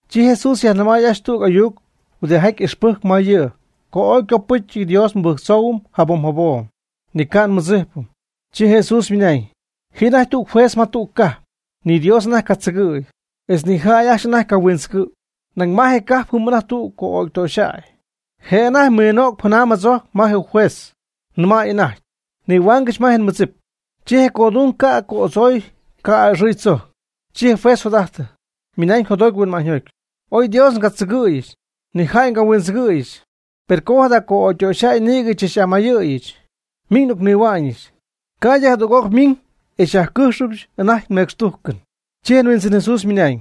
Chi Jesús yajnɨmay ajcxy tüg ayuc huɨdijaty ixpɨjcp ma yɨ' co ooy ycopɨ́cyɨty Dios nmɨbɨjctzoohuɨm jabom jabom, ni ca' nmɨdzijpɨm. Chi Jesús ymɨnañ: ―Ji anajty tüg juez ma tüg cajp, ni Dios anajty ca' tzɨgɨ̈y, etz ni jäy ajcxy anajty ca' huindzɨgɨ̈y. Nañ ma je cajp jɨm anajty tüg co'ögy ytöxyjäy. Je' anajty yminög janam jadzojc ma je juez, nɨmäy anajty: “Nihuaangɨch ma je nmɨdzipɨch.” Chi je codung ca' co'adzoy ca' a'ɨxɨy tzojc. Chi je juez jot'ajtɨ, ymɨnañ jotjoty huinma'ñyjoty: “Oy Dios ca' ndzɨgɨ̈yɨch, ni jäy ca' nhuindzɨgɨ̈yɨch, per com jada co'ögytöxyjäy nïgɨ xychach'amayɨ̈yɨch, miñ n'ocnihua'ñɨch, ca'ydɨ jadüg'oc ymiñ e xyajcɨjxɨch anajty nmecxtújcɨn.” Chi je Huindzɨn Jesús ymɨnañ: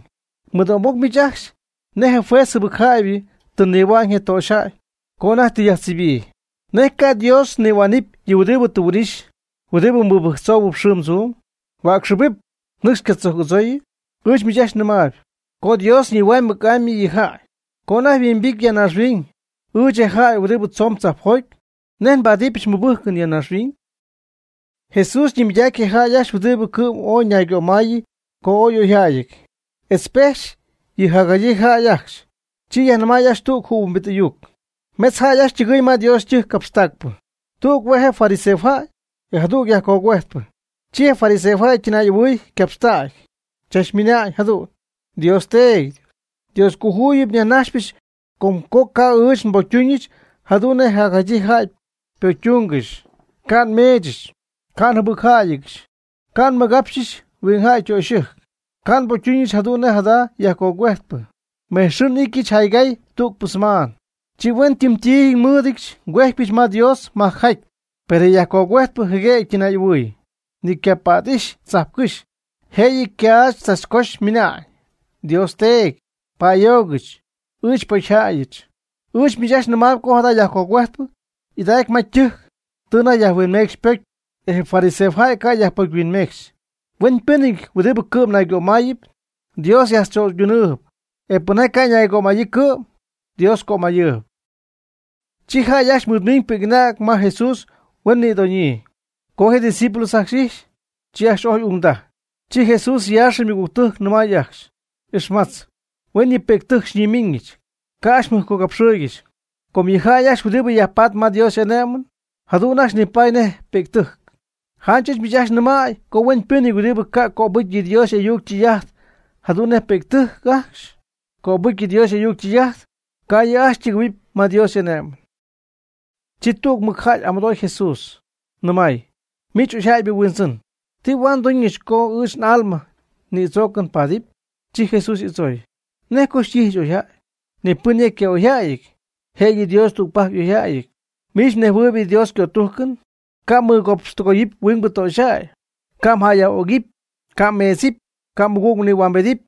―Mɨdo'mbɨc miich ajcxy nej je juez jɨbɨcjäybɨ tɨ nihuañ je töxyjäy co anajty tɨ yajtzibyii. ¿Nej ca' Dios ñihuaanɨp yɨ huɨdibɨ tɨ huin'ixy, huɨdibɨ mɨbɨjctzoob xɨɨm tzuum? ¿Huäcxɨbɨp, nɨcx ca' tzojc adzooyɨ? Ɨɨch miich ajcxy nɨmaayb co Dios ñihuänamy mɨc'amy yɨ' yjäy. Co anajty nhuimbity ya naaxhuiñ, ɨɨch, je jäy huɨdi tzoon tzajpjoty, ¿nej nbáadɨbɨch mɨbɨ́jcɨn ya naaxhuiñ? Jesús ñimɨydac je jäy ajcxy huɨdi cɨ'm ooy ñaygömayyii co ooy y'oyjäyɨty, etz pejxy yɨ jacjadyiibɨ jäy ajcxy, chi yajnɨmay ajcxy tüg jɨhuimbit ayuc: ―Mejtz jäy ajcxy ytɨgɨɨy ma Dios ytɨjc capxtacpɨ. Tüg hue' je' fariseojäy, e jadüg yajcogüejtpɨ. Chi je fariseojäy ytɨnay'ahuɨɨy ycapxtägy, chachmɨna'ñ jadu'n: “Dios Teedy, Dioscojuyip yajnajxpɨch com co ca' ɨɨch nbocytuñɨch jadu'n nej jacjadyii jäy ypocytúnngɨxy, ca' nmeechɨch, ca' njɨbɨcjäyɨdyɨch, ca' nmɨgapxɨch huingjäy ytöxyɨjc, ca' nbocytuñɨch jadu'n nej jada yajcogüejtpɨ. Mejtz xɨɨ n'ityɨch jaygay tügpɨ semaan. Chi huen ytɨm ti nmɨɨdɨch ngüejtpyɨch ma Dios majcjaty.” Per je yajcogüejtpɨ jɨguem ytɨnay'ahuɨɨy, ni ycapät'ixy tzajpcɨjx, jëyɨ ycaachtzachcoxy ymɨna'ñ: “Dios Teedy, pa'ayoogɨch, ɨɨch pocyjäyɨch.” Ɨɨch miich ajcxy nɨmaayb co jada yajcogüejtpɨ y'idacy ma ytɨjc tɨ anajty yajhuinmecxy ypocy, e je fariseojäy ca' yajpocyhuinmecxy. Huenpɨ́nɨty huɨdi cɨ'm naygömayɨpy, Dios yajtzöydunɨɨb; e pɨnjaty ca' ñaygömayyii cɨ'm, Dios ycömayɨɨb. Chi jäy ajcxy mɨɨdmiñ pi'c'anäg ma Jesús huen nïdoñyii. Co je' ydiscípulos ajcxy ijxy, chi ajcxy ojy ungdaj. Chi Jesús yaaxɨ ymɨgügtɨjc nɨmay ajcxy: ―Ixmatz, huen yɨ pi'ctɨjc xyñimiñɨch, ca' ajcxy mjɨjpcogapxɨɨygɨxy, com yɨ jäy ajcxy huɨdibɨ yajpatp ma Dios y'ané'mɨn, jadu'n ajcxy nipaady nej pi'ctɨjc. Janch ɨɨch miich ajcxy nɨmäy co hueñypɨ́nɨty huɨdi ca' cöbɨjcɨ yɨ Dios y'ayuc ytɨy'ajt jadu'n nej yɨ pi'ctɨjc ajcxy cöbɨjcy Dios y'ayuc ytɨy'ajt, ca' yɨ' ajcxy ytɨgɨ̈huɨpy ma Dios y'ané'mɨn. Chi tüg mɨcjäy y'amɨdooy Jesús, nɨmay: ―Miich oyjäybɨ Huindzɨn, ¿ti huaad nduñɨch co ɨɨch n'alma nïdzoocɨn paadɨpy? Chi Jesús y'adzooy: ―¿Nej co xytíjɨch oyjäy? Ni pɨn ya yca'oyjäyɨty, je'yɨ Dios tügpajc y'oyjäyɨty. Miich mnejhuɨɨyb yɨ Dios ycötújcɨn. Ca' mmɨgapxtɨgoyɨpy huingbɨ töxyjäy, ca' jäyyaj'ögɨpy, ca' mmeedzɨp, ca' mmɨgüg nïhuambedɨpy,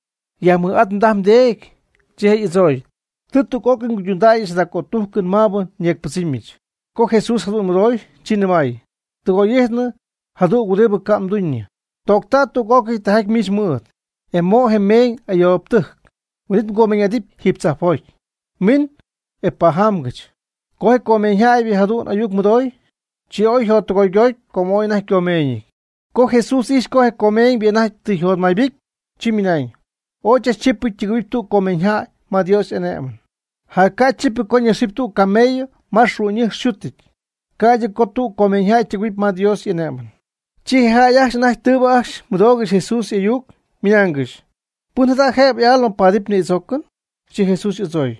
yajmɨj'at mdaj mdeedy. Chi je' y'adzooy: ―Tɨ tüg'öcɨy nguydundäyɨch jada cötújcɨn maabɨ nyeecpɨdzɨmyɨch. Co Jesús jadu'n mɨdooy, chi nɨmay: ―Tɨgoy'ijtnɨ ja tüg huɨdi ca' mduñɨ. Toocta' tüg'ócɨy tijaty miich mɨɨd, e mo' je meeñ ayoobtɨjc, huin'it mgomeeñ'adɨpy jiiby tzajpjoty; miin, e pajamgɨch. Co je comeeñybɨ jadu'n ayuc mɨdoy, chi ooy yjottɨgoygoty com ooy anajty ycomeeñɨty. Co Jesús ijxy co je comeeñybɨ anajty tɨ yjotmaybɨcy, chi mɨnañ: ―Ooy chachchípɨty ytɨgɨ̈huɨpy tüg comeeñyjäy ma Dios y'ané'mɨn. Jac ca' chípɨty co ñaxɨpy tüg camello ma yɨ xu'ñ yxútɨty, ca'ydɨ co tüg comeeñyjäy ytɨgɨ̈huɨpy ma Dios y'ané'mɨn. Chi je jäy ajcxy anajty tɨɨbɨ ajcxy mɨdoogɨxy Jesús y'ayuc, ymɨnaangɨxy: ―¿Pɨn jada' jëbɨ y'alma paadɨpy nïdzoocɨn? Chi Jesús y'adzooy: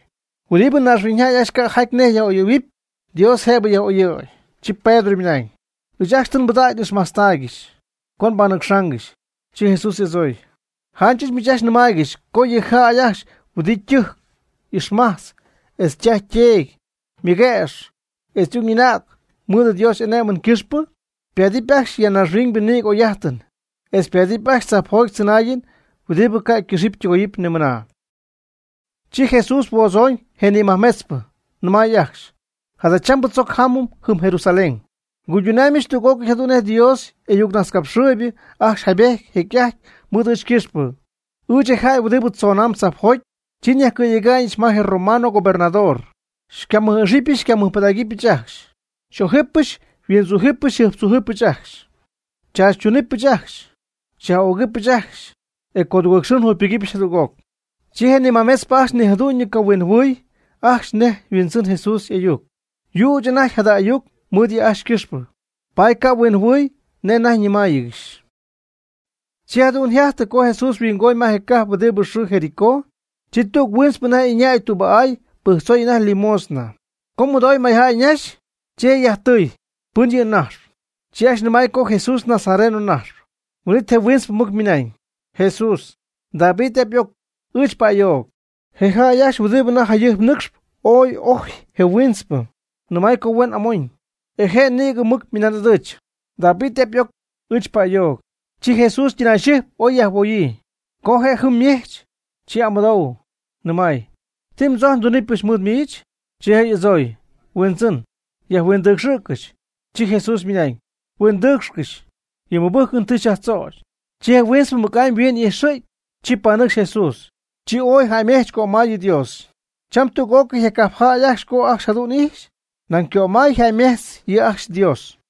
―Huɨdibɨ naaxhuiñyjäy ajcxy ca' jaty nej yaj'oyɨ̈huɨpy, Dios jëbɨ yaj'oyɨ̈y. Chi Pedro ymɨnañ: ―Ɨɨch ajcxy tɨ nbɨdägy n'ixmajtztaaygɨxy, co nbanɨcxaangɨxy. Chi Jesús y'adzooy: ―Janch ɨɨch miich ajcxy nnɨmaaygɨxy co yɨ jäy ajcxy huɨdi ytɨjc ixmajtz etz ytaj yteedy, ymɨguëx, etz y'ung y'anäg mɨɨd Dios y'ané'mɨn ycɨxpɨ, ypáadɨpy ajcxy ya naaxhuiñ nïgɨ oy'ájtɨn, etz ypaadɨpy ajcxy tzajpjoty tzɨnaayɨn huɨdi ca' ycɨxɨpy ytɨgoyɨpy nimɨna. Chi Jesús huodzon je nimajmetzpɨ, nɨmay ajcxy: ―Jadachambɨ tzoc jámɨm jɨm Jerusalén. Nguydunaamyɨch tüg'ócɨy jadu'n nej yɨ Dios y'ayucnajtzcapxɨɨybɨ ajcxy jaybejty jecy'ajty mɨɨd ɨɨch ycɨxpɨ, ɨɨch, je jäy huɨdi tzoon tzajpjoty. Chi nyajcɨ̈yega'ñɨch ma je romano gobernador, xycamɨj'ixɨpy xycamɨjpɨdägɨbɨch ajcxy. Xy'ójɨbɨch xyhuindzújɨbɨch xyjɨjptzújɨbɨch ajcxy. Xychaachytunɨpyɨch ajcxy, xyaj'ögɨbɨch ajcxy, e codugɨɨg xɨɨ njugypɨgɨpyɨch jadüg'oc. Chi yɨ majmetzpɨ ajcxy ni jadu'ñyɨ ca' huinjɨhuɨɨy ajcxy nej yhuimbɨdzɨmy Jesús y'ayuc. Yüch anajty jada ayuc mɨɨd yɨ' ajcxy ycɨxpɨ, paady ca' huinjɨhuɨɨy nej anajty yajnɨmaaygɨxy. Chi jadu'n yjajtɨ co Jesús mɨhuingoñ je cajp huɨdi yxɨɨ Jericó, chi tüg huintzpɨ anajty ɨñäy tüba'áy pɨjctzoy anajty limosna. Co mɨdooy mayjäy ñaxy, chi je' yajtɨy: ―¿Pɨn yɨ' ñajxp? Chi ajcxy nɨmay co Jesús nazareno najxp. Huin'it je huintzpɨ mɨc ymɨnañ: ―Jesús, David y'ap y'oc, ɨɨch pa'ayoog. Je jäy ajcxy huɨdi anajty jayɨjp nɨcxp ooy ojy je huintzpɨ, nɨmay co huen amoñ. E je' nïgɨ mɨc ymɨnan'ɨdɨ̈ch: ―David y'ap y'oc, ɨɨch pa'ayoog. Chi Jesús ytɨnayxɨjpy oy yajhuoyii. Co je' jɨm ymejch, chi amɨdoy, nɨmay: ―¿Ti mdzojcpy ndunɨpyɨch mɨɨd miich? Chi je' y'adzooy: ―Huindzɨn, yajhuindɨcxɨ̈ccɨch. Chi Jesús mɨnañ: ―Huindɨcxɨ̈g, yɨ mmɨbɨ́jcɨn tɨ xyajtzögy. Chi je huintzpɨ mɨc'amy yhuin y'ijxɨ̈gy, chi panɨcxy Jesús, chi ooy jäymejch cömay yɨ Dios. Cham tüg'ócɨy je cajp jäy co ajcxy jadu'n ijxy, nañ ycömay yjäymejtz yɨ ajcxy Dios.